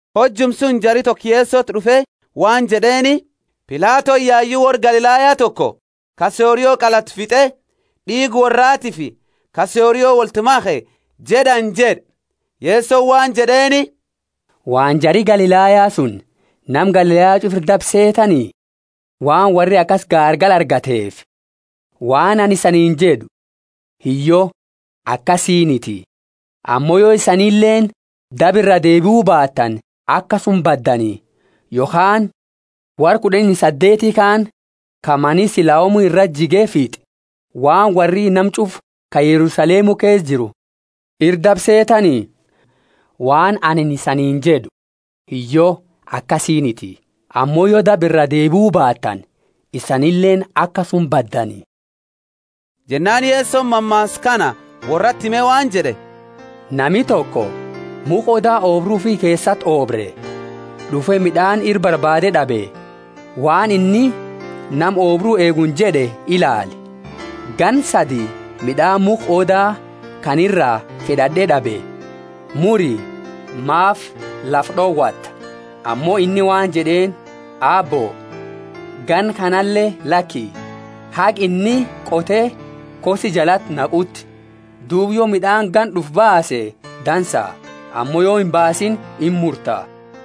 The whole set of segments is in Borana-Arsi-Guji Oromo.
Hojuma suni jari toko Yesoti d'ufe waan jed'eeni, Pilatoni yayu worra Galilaya toko ka sorio qalatu fit'e, d'iiga worraatiifi ka sorio wolti makhe jed'ani jed'e. Yesoni waan jed'eeni, Waan jari Galilaya suni nama Galilaya ch'ufa ira dabe seetani, waan worri akasi gaargala argateefi? Waan anini isaniini jed'u, Hiyyo, akasiiniti. Ammo yo isanileeni daba iraa deebiu baatani akasuma baddani. Yokhaani worra kud'ani saddeeti kaani, ka mani Siloamu irati jige fit'e, waan worri nama ch'ufa ka Yerusalemu keesa jiru ira dabe seetani? Waan anini isaniini jed'u, Hiyyo, akasiiniti. Ammo yo daba iraa deebiu baatani isanileeni akasuma baddani. Jennaani Yesoni mammaasa kana worrati hime waan jed'e, Nami toko mukha odaa oobru ufi keesati oobre; d'ufe mid'aani ira barbaade d'abe. Waan inni nama oobru eeguuni jed'e Ilaali, ganna sadi mid'aani mukha odaa kana iraa fed'ad'e d'abe. Muri; maafi lafa d'owata? Ammo inni waan jed'eeni, Aabbo, ganna kanale laki, haga anini qote kossi jalati naquuti. Duuba yo mid'aani ganna d'ufu baase dansa; ammo yo imbaasiini imurta.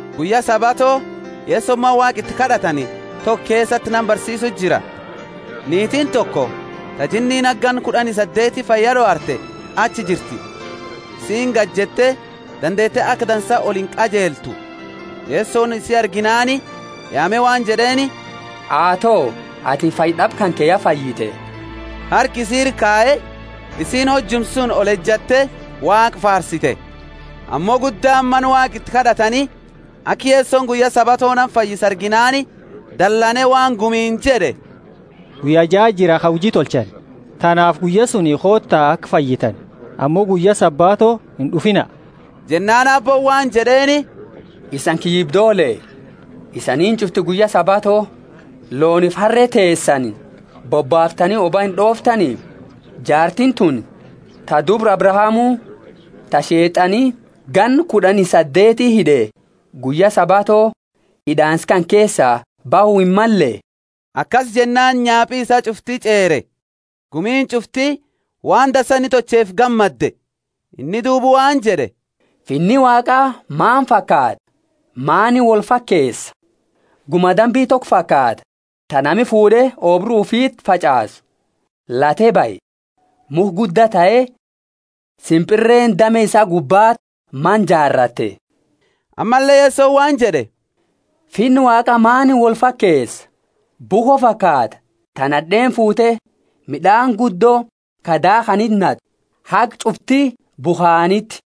Guyya Sabato Yesoni mana Waaqa iti kad'atani toko keesati nama barsiisu jira. Niitiini toko ta jinniini haga ganna kud'ani saddeeti fayya d'owarte achi jirti; isiini gajette dandeete aka dansa olinqajeltu. Yesoni isi arginaani yaame waan jed'eeni, Aato, atini fayyad'aba kanke ya fayyite! Harka isi ira kaye, isiini hojuma suni olejatte Waaqa faarsite. Ammo guddaani mana Waaqa iti kad'atani aka Yesoni guyya Sabato nama fayyisu arginaani dalane waan gumiini jed'e, Guyya jaati jira ka huji tolchani; tanaafi guyya suni koota aka fayyitani, ammo guyya Sabato ind'ufiina. Jennaani Aabbooni waan jed'eeni, Isani kiyyibdoole, isani ch'ufti guyya Sabato loonifi harre teesani bobbaaftani oba ind'ooftani? Jaartiini tuni, ta dubra Abrahamu, ta Sheet'ani ganna kud'ani saddeeti hid'e, guyya Sabato hid'aansa kana keesa bahu himmalle? Akasi jennaani nyaapi isaa ch'ufti ch'eere; gumiini ch'ufti waan dansa inni tolcheefi gammadde. Inni duuba waan jed'e, Finni Waaqa maani fakaata? Maani woli fakeesa? Guma dambi toko fakaata, ta nami fuud'e oobru ufiti fach'aasu; late bahe, mukha gudda tahe, simpirreeni dame isaa gubbaa mana jaaratte. Ammalle Yesoni waan jed'e, Finna Waaqa maani wolfakeesa? Bukho fakaata, ta nad'eeni fuute mid'aani guddo ka daakhaniti nat'u, haga ch'ufti bukhaaniti.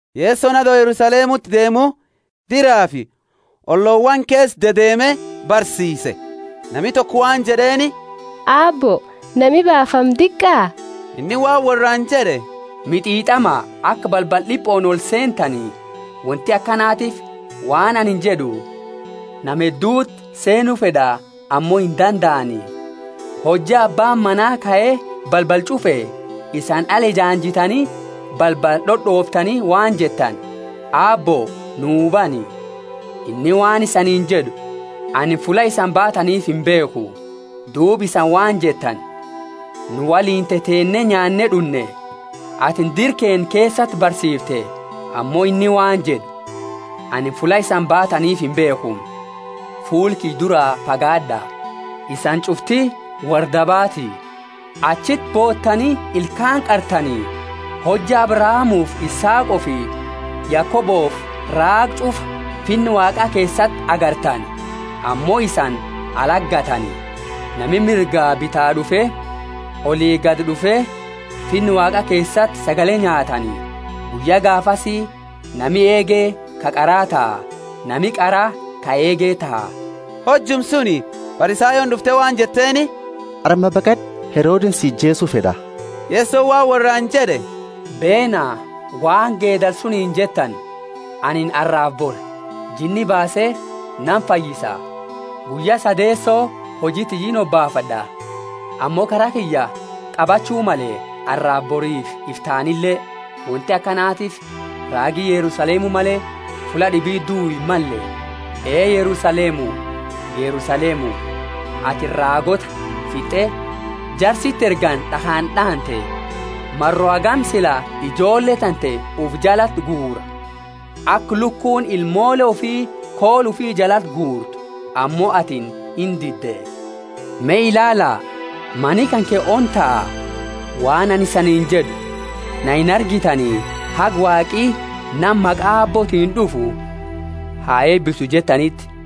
Yesoni ato Yerusalemuti deemu diraafi ollowaani keesa dedeeme barsiise. Nami toko waan jed'eeni, Aabbo, nami baafamu diqa? Inni waan worraani jed'e, Mit'it'ama aka balbala d'ipooni olseentani; wonti akanatiifi, waan anini jed'u, nama hedduti seenu fed'a ammo indandaani. Hojja abbaani mana kae balbala ch'ufe, isani ala ejaanjitani balbala d'od'ooftani waan jettani, Aabbo, nu bani, Inni waan isaniini jed'u, Anini fulla isani baataniifi imbeekhu. Duuba isani waan jettani, Nu woliini teteenne nyaanne d'unne, atini dira keenna keesati barsiifte. Ammo inni waan jed'u, Anini fulla isani baataniifi imbeekhu. Fuula kiyya dura fagaad'a, isani ch'ufti worra dabaati. Achiti bootani ilkaani qartani hojja Abrahamufi Isaaqofi Yakobofi raaga ch'ufa Finna Waaqa keesati agartani; ammo isani alati gatani. Nami mirga bitaa d'ufe, oli gadi d'ufe, Finna Waaqa keesati sagale nyaatani. Guyya gaafasi nami eege ka qara taha, nami qara ka eege taha. Hojuma suni Farisayooni d'ufte waan jetteeni, Arma baqad'u, Herodeni si ijeesu fed'a. Yesoni waan worraani jed'e, Beena, waan geedala suniini jettani, Anini arrafi bori jinni baase nama fayyisa, guyya sadeeso huji tiyya inhobaafad'a. Ammo kara kiyya qabachu male arrafi borifi iftaanile; wonti akanatiifi raagi Yerusalemu male fulla d'ibiti duu himmalle. Ee Yerusalemu, Yerusalemu, atini raagoota fitt'e, jara siti ergani d'akhaani d'aante! Maro hagami sila ijoolle tante ufi jalati guura, aka lukuuni ilmoole ufi koola ufi jalati guurtu, ammo atini indidde. Me ilaala, Mani kanke ona taha. Waan anini isaniini jed'u, Na inargitani haga, Waaqi nama maqa Aabbootiini d'ufu ha eebisu jettaniti.